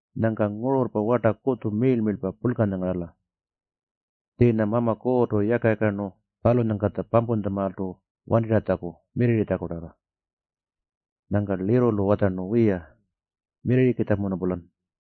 Nyangka ngururrpa warta kutju miirl-miirlpa purlkanya ngarala. Tjiinya Mama Kuurrtu yaka-yakarnu palunyangkatja pampuntjamaaltu wantirratjaku mirrirritjakutarra.” Nyangka lirrulu watjarnu, “Wiya, mirrirrikitjamunu-pulan.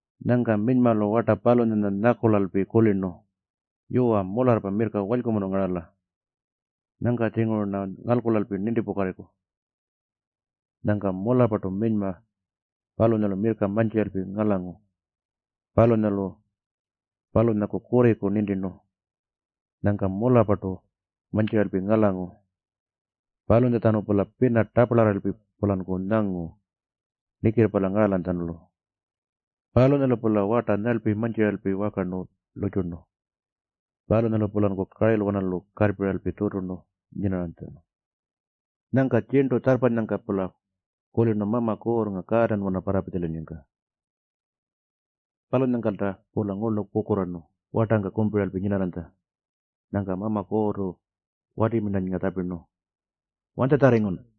Nyangka minymalu warta palunyanya nyakulalpi kulirnu, “Yuwa, mularrpa mirrka walykumunu ngarala. Nyangka-tjinguru-rna ngalkulalpi nintipukarriku.” Nyangka mularrpartu minyma palunyalu mirrka mantjiralpi ngalangu. Palunyalu palunyaku kurriku nintirnu. Nyangka mularrpartu mantjiralpi ngalangu. Palunyatjanu-pula pina taparlarraralpi-pulanku nyangu nikirrpalya ngaralanytjalu. Palunyalu-pula warta nyarlpi mantjiralpi wakarnu lurrtjurnu. Palunyalu-pulanku karilwanalu karrpiralpi tjuturnu nyinarranytja. Nyangka tjirntu tjarrpanyangka-pula kulirnu Mama Kuurrnga kaatanwana parrapitjalayinnyangka. Palunyangkalta-pula ngurlu kukurraarnu wartangka kumpiralpi nyinarranytja. Nyangka Mama Kuurrtu wati tjapirnu, “Wanytjatjarringun?”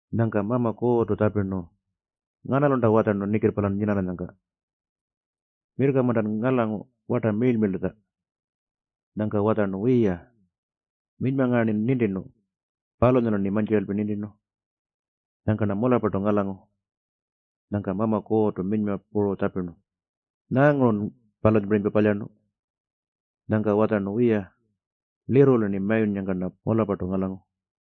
Nyangka Mama Kuurrtu tjapirnu, “Nganalunta watjarnu nikirrpalyan nyinarranyangka? Mirrka-muntan ngalangu warta miirl-miirltatja?” Nyangka watjarnu, “Wiya, minyma ngaa-rnin nintirnu, palunyalu-rni mantjiralpi nintirnu. Nyangka-rna mularrpartu ngalangu.” Nyangka Mama Kuurrtu minyma puru tjapirnu, “Nyaangurun palunyapirinypa palyarnu?” Nyangka watjarnu, “Wiya, lirrulu-rni mayunnyangka-rna mularrpartu ngalangu.”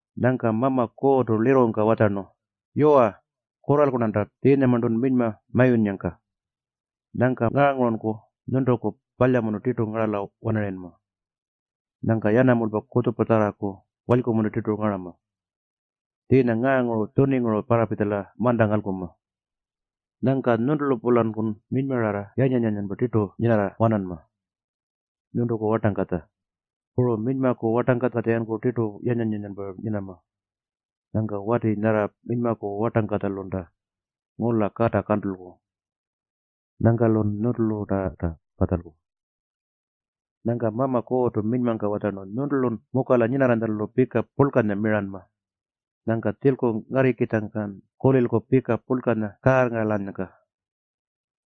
Nyangka Mama Kuurrtu lirrungka watjarnu, “Yuwa, kurralku-rnanta tjiinyamarntun minyma mayunnyangka. Nyangka ngaangurunku nyuntuku palyamunu tirtu ngarala-wanarayinma. Nyangka yanamulpa kutjupatjarraku walykumunu tirtu ngarama. Tjiinya ngaangurun tjuninguru parrapitjala manta ngalkunma. Nyangka nyuntulu-pulankun minymararra yanyan-yanyanpa tirtu nyinarra-wananma. Nyuntuku wartangkatja, puru minymaku wartangkatja-yankun tirtu yanyan-yanyanpa nyinama. Nyangka wati nyarra minymaku wartangkatjalunta ngula kata kantulku. Nyangka-lun nyuntulu tarta patjalku.” Nyangka Mama Kuurrtu minymangka watjarnu, “Nyuntulun mukala nyinarranytjalu pika purlkanya miranma. Nyangka tjilku ngarrikitjangkan kulilku pika purlkanya kaarrngaralanyangka.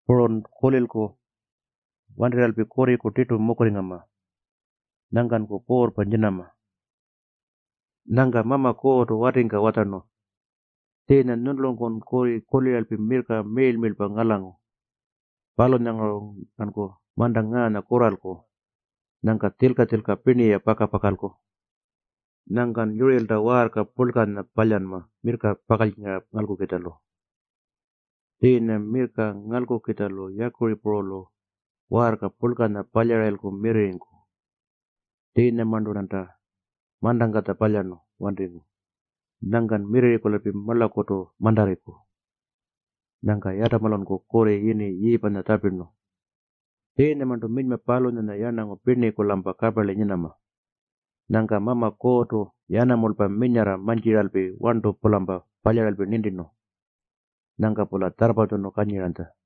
Purun kulilku wantirralpi kurriku tirtu mukurringama. Nyangkanku puurrpa nyinama.” Nyangka Mama Kuurrtu watingka watjarnu, “Tjiinyan nyuntulunku kurri kuliralpi mirrka miirl-miirlpa ngalangu. Palunyanguru-rnanku manta ngaanya kurralku. Nyangka tjilka-tjilka pirni-ya paka-pakalku. Nyangkan yurirlta waarka purlkanya palyanma mirrka pakaltjingara ngalkukitjalu. Tjiinyan mirrka ngalkukitjalu yakuripurulu waarka purlkanya palyarayilku mirrirringku. Tjiinyamarntu-rnanta mantangkatja palyarnu wantingu. Nyangkan mirrirringkulalpi marlakurtu mantarriku.” Nyangka Yatamalunku kurri yini Yiipanya tjapirnu. Tjiinyamarntu minyma palunyanya yarnangu pirniku-lampa kaparli nyinama. Nyangka Mama Kuurrtu yanamulpa minyarra mantjiralpi warntu-pulampa palyaralpi nintirnu. Nyangka-pula tjarrpatjunu kanyiranytja.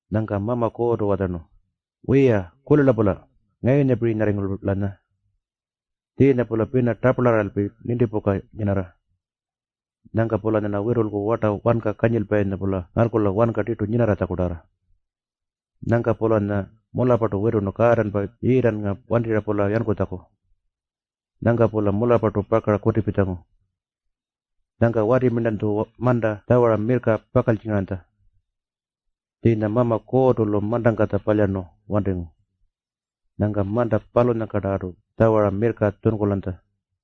Nyangka Mama Kuurrtu watjarnu, “Wiya-kulila-pula ngayunyapirinyarringu-lanya. Tjiinya-pula pina taparlarraralpi nintipuka nyinarra. Nyangka-pulanyarna witulku warta wanka kanyilpayinya-pula ngalkula wanka tirtu nyinatjakutarra.” Nyangka-pulanya mularrpartu witurnu kaatanpa Yiitannga wantirra-pula yankutjaku. Nyangka-pula mularrpartu pakara kutipitjangu. Nyangka watilu manta tjawara mirrka pakaltjingaranytja. Tjiinya Mama Kuurrtu-lu mantangkatja palyarnu wantingu. Nyangka manta palunyangkartu tjawara mirrka tjunkulanytja.